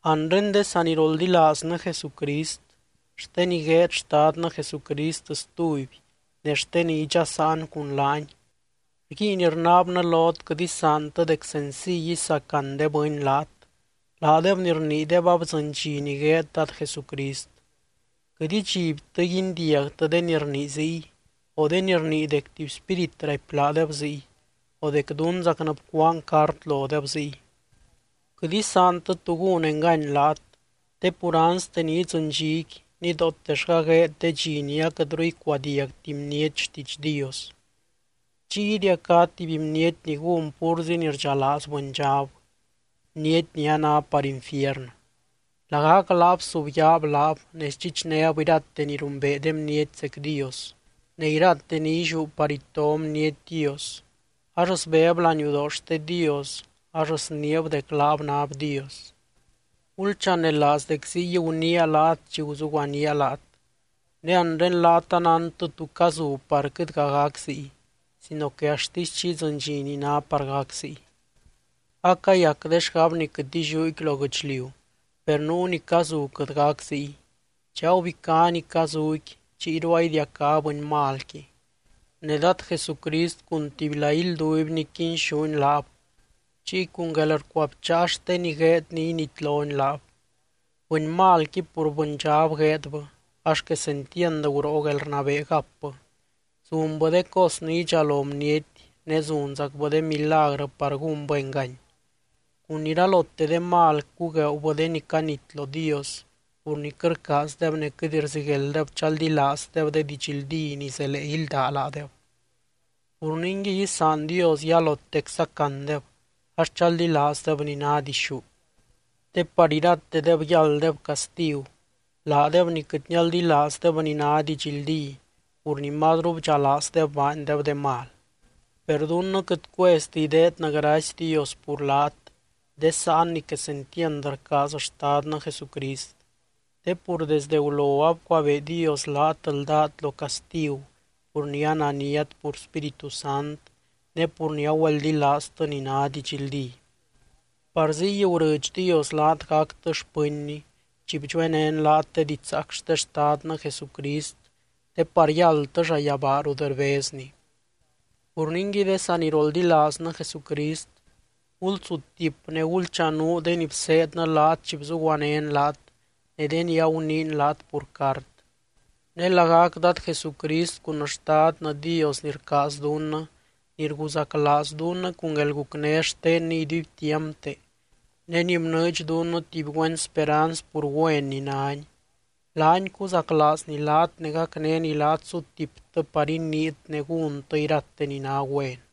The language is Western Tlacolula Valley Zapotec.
Anre de saniroldilaaznɨ Jesucrist, xte ni gueed Xtadnɨ Jesucrist stuby ne xte ni idxasaan cun laany, rguiin rnaabnɨ lot quɨt isaantɨ dec senciy isacan de bɨny laat, laadeb ni rniideb abdzɨny dxi ni gueed Dad Jesucrist. Quɨt idxibtɨ guindiagtɨ de ni rnii ziy, o de ni rnii dec tuby spírit raipy laadeb ziy, o dec dunzacnɨ bcuaan cart lodeb ziy. Quɨt isaantɨ tu gún engany laat, te pur anste ni idzɨny dxiqui, nidootellga gueed de dxi ni aquɨtru icuadiagti bniety xtiidx Dios. Chiy idiacá tuby bniety ni gún púrzi ni rdxalaaz bɨndxab, bniety ni a ná par infiernɨ. Lagac laab subyaab laab ne sdxichnéb irate ni rumbee de bniety zec Dios, ne irate ni illiú par ito bniety Dios, axt sbeb laniudoo xte Dios ax sniib dec laab náb Dios. Gulchanelaaz dec ziy guniia laat chi guzuguanía laat. Ne anre laat anántɨ tú cazu par quɨtga gac ziy, sino que axtisy chi idzɨny dxi ni ná par gac ziy. Acayac de xgab ni quɨt illiúqui lo guɨchliu, per nuu ni cazu quɨt gac ziy. Chi agubicá ni cazuqui, chiyru aidiacá bɨny malqui. Ne Dad Jesucrist cun tubyla ilduibny quinxúny laab, chiy cun guelrcuabcháa xte ni gueedny initlony laab. Bɨny malqui pur bɨndxab gueedbɨ, ax quesentiand guroo guelrnabee gapbɨ. Zunbɨ de cos ni idxalo bniety, ne zunzacbɨ de milagrɨ par gúnbɨ engany. Cun iralote de mal cugueubɨ de ni canit lo Dios, pur ni quɨt rcaazdeb ne quɨt rziguelddeb chaldilaazdeb de didxldí ni zelee ílda laadeb. Pur ningui isaan Dios yalotec sacandeb, ax chaldilaazdeb ni ná dixú. Te par iratedeb yálddeb castigu, laadeb ni quɨt nialdilaazdeb ni ná didxldí pur ni mazru bdxalaazdeb baandeb de mal. Per dunnɨ quɨt cuezti ideednɨ gracy Dios pur laat, de sáan ni quesentiand rcaaz Xtadnɨ Jesucrist. Te pur desde gulo abcuabee Dios laat ldát lo castigu pur ni ananiat pur Spíritu Sant, ne pur ni agüeldilaaztɨ ni ná didxldí. Par ziy gurɨdx Dios laat gactɨ xpɨnny chi bdxuenén laat de didxzaac xte Xtadnɨ Jesucrist, te par yáldtɨ llayabaa rut rbezny. Pur ningui de saniroldilaaznɨ Jesucrist, gulsutip ne gulchanuu de ni bseednɨ laat chi bzuguanén laat ne de ni aguniin laat pur cart. Ne lagac Dad Jesucrist cun Xtadnɨ Dios ni rcaaz dunnɨ, ni rguzaclaaz dunnɨ cun guelgucné xtenny iduibtiampte, ne ni bnɨɨdx dunnɨ tuby güen speranz pur güen ni nány, laany cuzaclaazny laat ne gacnény laat sutiptɨ par iniit ne gúntɨ irate ni ná güen.